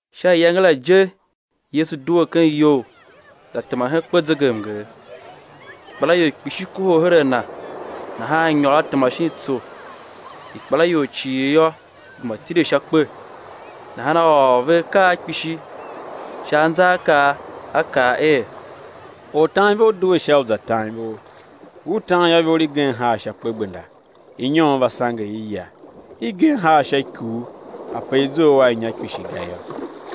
Sha iyange la je Yesu due ken iyou, za tema hen kpezegemnger. Ikpelaior kpishi kohol her a Na; nahan A nyôr A tema shin tsô. Ikpelaior cii yô, gema tile sha kpe. Nahan A ôr ve akaa kpishi sha anzaakaa, A kaa er: Ortanivor due sha u za tan ivor. Ngur tan yô, ivor igen haa sha kpegbenda; inyon va, sange i, ya. Igen haa sha ikuu, ape i zough a inya kpishi ga yô;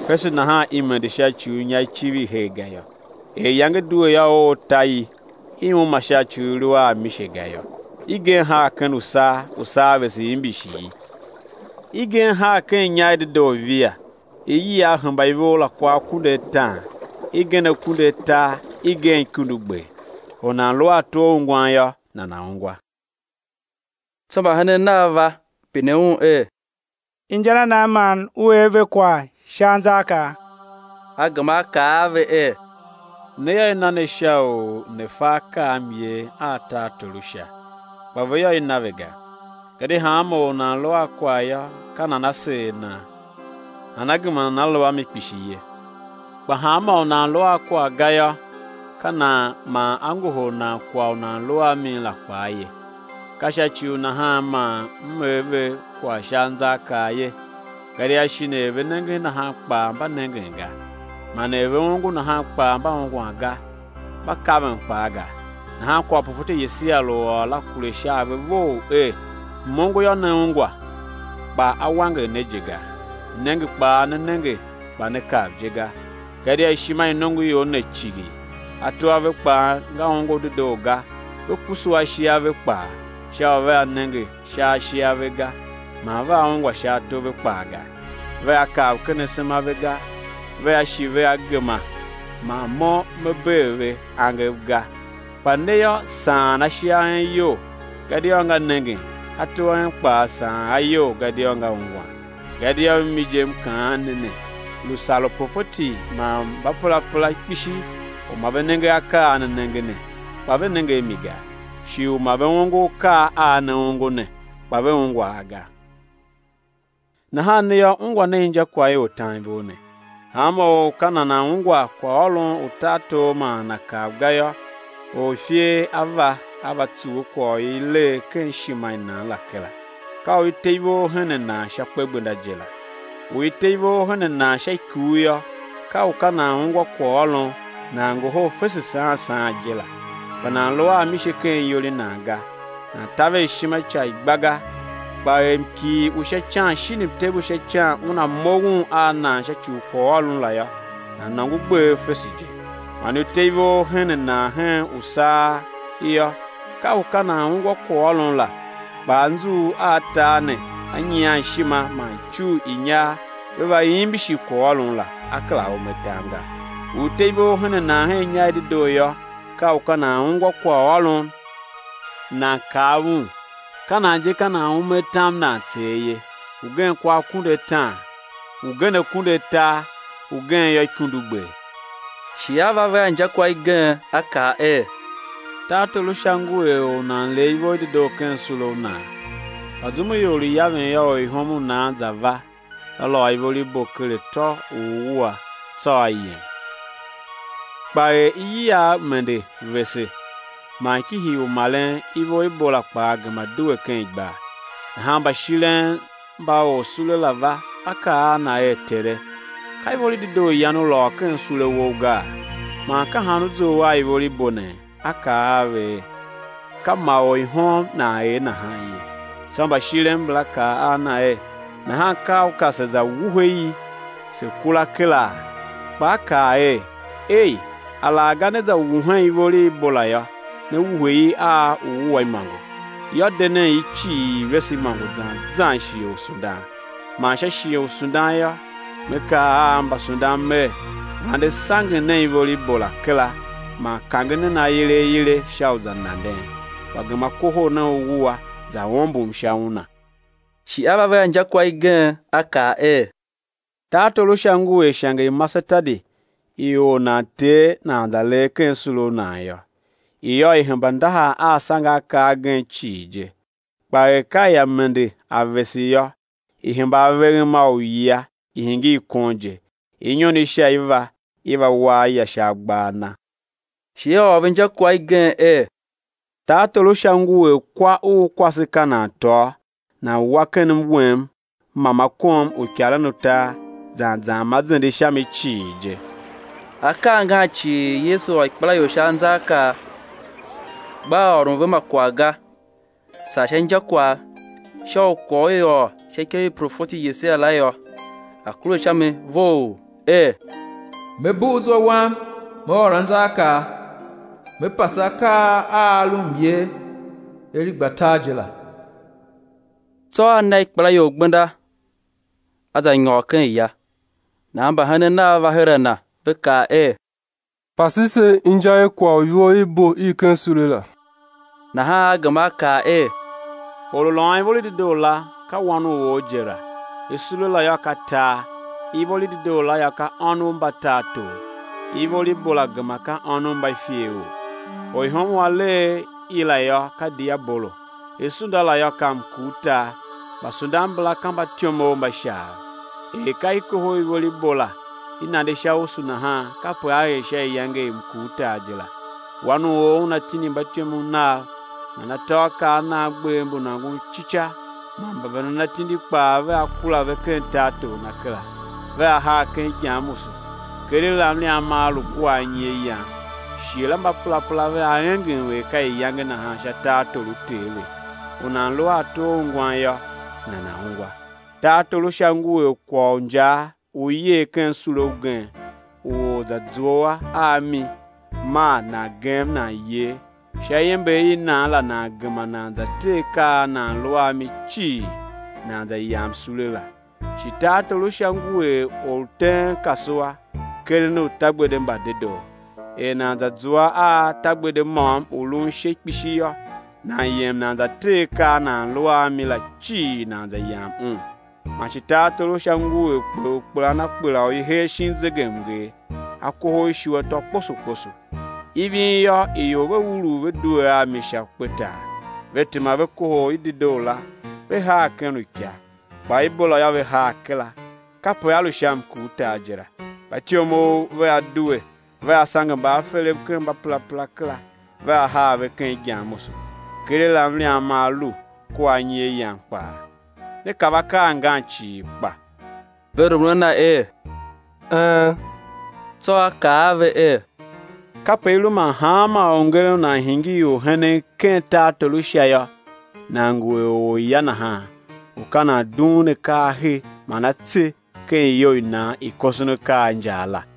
fese nahan i mende sha ci u inya i civir her ga yô. Er iyange due yô, oo ta i, i uma sha ci u i lu a mise ga yô. Igen haa ken usaa; usaa vese imbishi i. Igen haa ken inya i dedoo; via, iyiagh hemba ivor la kwa akunduataan, igen akunduatar, igen ikundugber. Or u nan lu a ato a ungwan yô, nana̱ ungwa. Tsô mbahenen Nav va, pine Un er: Inja na nan man U er ve kwagh sha anzaakaa? A gema A kaa a ve er: Ne yô, i na ne sha u ne̱ fa akaa a myer a tartor u Sha, kpa ve yô, i na ve ga. Gadia hanma or u nan lu a kwagh yô, ka nan á seer nan nana gema nana lu a mi kpishi ye; kpa hanmô u nan lu a kwagh ga yô, ka nan man á ngohol nan kwagh u nan lu a mi la kpaa ye. Ka sha ci u nahan man M er ve kwagh sha anzaakaa ye, gadia shin er ve nengen nahan kpaa mba nengen ga, man er ve ongo nahan kpaa mba ungwan ga, mba kaven kpaa ga. Nahan kwagh u profeti Yesaia lu ôr la kure sha a ve vough er: M-ongo yô, né ungwa, kpa á wanger ne je ga. Mnenge kpaa né nenge, kpa né kav je ga. Gadia ishima i nongoior ne cighir, ato a ve kpaa nga ongo dedoo ga; ve kusu ashe a ve kpaa, sha u vea nenge sha ashe a ve ga; man vea ungwa sha ato a ve kpaa ga, vea kav ken asema a ve ga, vea shi vea gema man Mo Me bee ve angev ga. Kpa ne yô, saan ashe a en iyol, gadia nga nengen, ato a en kpaa saan a iyol gadia nga ungwan. Gadia mimi je M kaan ne ne, lu sar uprofeti man mbaperapera kpishi u ma ve nenge akaa a ne nenge ne, kpa ve nenge a mi ga, shi u ma ve ongo akaa a ne ongo ne, kpa ve ungwa a ga. Nahan ne yô, ungwa nen injakwagh i ortanivor ne: Hanma or u ka nana̱ ungwa kwaghôron u tartor man nana̱ kav ga yô, or u ifer a va, a va tsuwe kwagh u i lee ken ishima i nan la kera; ka u i te ivor hen a nan sha kpegbenda je la. U i te ivor hen a nan sha ikuu yô, ka u ka nan ungwa kwaghôron, nan ngohol fese saan saan je la; kpa nan lu a mise ken iyol i nan ga, nan taver ishima ica i gba ga; kpa er mkighir u sha ican shin mtev u sha ican una moughon a nan sha ci u kwaghôron la yô, nan nôngo gbev fese je. Man u i te ivor i nan ken usaa yô, ka u ka nan ungwa kwaghôron la kpa anzughul a tar ne a nyian ishima man icugh i inyar ve va imbishi kwaghôron la, a kera ume atam ga. U i te ivor hen a nan hen inya i dedoo yô, ka u ka nan ungwa kwaghôron, nan kav un; ka nan je ka nan ume atam nan tser ye; ugen kwa akunduataan, ugen akunduatar, ugen yô, ikundugber. Shi A va ve a injakwagh igen, A kaa er: Tartor u Sha ngu er or u nan lee ivor i dedoo ken sule u nan. Kpa zum u ior lu yaven yô, orihom u nan za va, va lôô ivor i bo ker atô u uwua, tsô a yem. Kpa er iyiagh mende vese, man ki hiin u maren yô, ivor i bo la kpaa gema due ken igbar. Nahan mbashiren mba orsule la va, va kaa a na er: Tere, ka ivor i dedoo yan u lôô ken sule wou gaa, man ka han u zough a ivor i bo nee? A kaa a ve er: Ka ma orihom nan er nahan ye. Tsô mbashiren mbala kaa a na er: Nahan ka u ka se̱ za wuhe i se̱ kura kera? Kpa a kaa er: Ei, alaghga né za wuhen ivor i bo la yô, né wuhe i a uwua imôngo. Yô, de nen i cii, i̱ vese imôngo zan zan shighe u sundan; man sha shighe u sundan yô, me kaa a mbasundan mer: Vande sangen nen ivor i bo la kera man kange nen aile aile sha u za nanden; kpa gema kohol nen uwua, za ombom sha wuna. Shi A va ve a injakwagh igen, A kaa er: Tartor u Sha ngu er ishange i masetadi i or nan tee nan za lee ken sule u nan yô. I yô, i hemba ndahar a asangeakaa agen cii je; kpa er ka ia mende a vese yô, i hemba aveghem a uyia i̱ hingir kon je, inyon i sha i va, i va wa aya sha agbaa a na. Shi A ôr ve injakwagh igen er: Tartor u Sha ngu er kwa u kwase ka nan tôô, nan wa ken mwem ma ma kom uikaren utar zan zan u zende sha mi cii je. Akaa angan cii Yesu ôr ikpelaior sha anzaakaa, gbaa ôron ve ma kwagh ga, saa sha injakwagh; sha u kwagh u i ôr sha ikev i profeti Yesaia la yô, a̱ kure sha mi vough, er: Me bugh zwa Wam Me ôr anzaakaa. Me pase akaa a a lu myer er i gba tar je la. Tsô A na ikpelaior gbenda A za nyôr ken ya, Nahan mbahenen Nav va her a Na, ve kaa er: Pase se inja i kwagh u ivor i bo i ken sule la. Nahan A gema A kaa er: Or u lôôn ivor i dedoo la, ka Wan u or je la. Sule la yô, ka tar; ivor i dedoo la yô, ka ônov mba tartor; ivor i bo la gema ka ônov mba iferor. Orihom u a lee i la yô, ka diabolo; sunda la yô, ka mkurtar; mbasundan mbala yô, ka mbatyomov mba Shaav. Er ka i kohol ivor i bo la, i nande sha usu nahan, kape á er sha iyange i mkurtar je la. Wan u or Una tindi mbatyomov Nav, man atôakaa a nan gbev mbu nôngon ci ca, man mbavendan atindi kpaa vea kura ve ken tartor Na kera, vea haa ken igyamusu; keregh la mliam maa lu kua anyi a yan. Shighe la mbaperapera vea engem er ka iyange nahan sha tartor u Ter ve. U nan lu a ato a ungwan yô, nana̱ ungwa. Tartor u Sha ngu er kwagh u injaa u i yer ken sule ugen, u or za zua a mi, maa nan gem nan yer; sha iember i nan la nan gema nan za tee akaa a nan lu a mi la cii, nan za yam sule la. Shi tartor u Sha ngu er or u teen kasua, keren utagbede mba dedoo. Er nan za zua a tagbede môm u lun ishe kpishi yô, nan yem nan za tee akaa a nan lu a mi la cii, nan za yam un. Man shi tartor u Sha ngu er kper u kpelan a kpela u i hee shin zegemnger, a kohol ishu atô kposo kposo. Ivin yô, ior ve urugh ve due a mi sha kpetar, ve tema ve kohol i dedoo la, ve haa ken uika, kpa i bo la yô, ve haa kera. Kape á lu sha mkurtar je la. Mbatyomov vea due, vea sange mbaaferev ken mbaperapera kera; vea haa ve ken igyamusu, keregh la mliam maa lu kua anyi a yan kpaa. Ne kav akaa angan cii kpa? Ve rumun a Na er: Een! Tsô A kaa a ve er: Kape i lu man hanma orngeren u nan hingir orhenen ken tartor u Sha yô, nan ngu er orya nahan u ka nan dughun akaa a he man a tse ken iyou i nan i koson akaa a injaa la.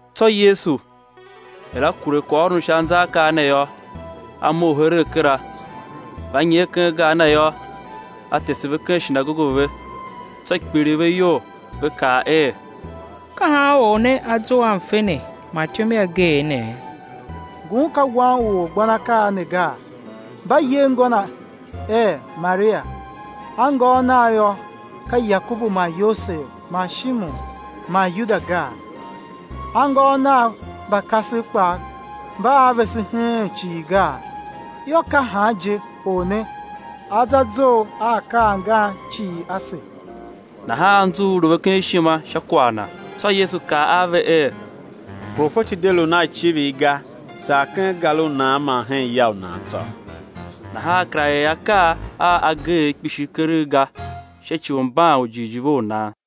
Tsô Yesu, er A kure kwaghôron u sha anzaakaa ne yô, A mough heregh kera. Va nyer ken gar Na yô, A tese ve ken shinagoge ve, tsô kpiligh ve iyol, ve kaa er: Ka han Or ne A zough a mfe ne man ityom i ageegh ne? Ngun ka Wan u orgbanakaa ne gaa? Mba yer ngô Na er, Maria; anngôôv Nav yô, ka Yakobu man Yosev man Shimon man Yuda gaa? Anngôôv Nav mba kasev kpaa mba a vese heen cii gaa? Yô, ka han je Or ne A za zough a akaa angan cii ase? Nahan anzughul lu ve ken ishima sha kwagh Na. Tsô Yesu kaa a ve er: Profeti de lun a icivir ga, saa ken gar u nan man hen ya u nan tsô. Nahan A kera er akaa a ageegh kpishi keregh ga sha ci u mban u jighjigh ve u nan.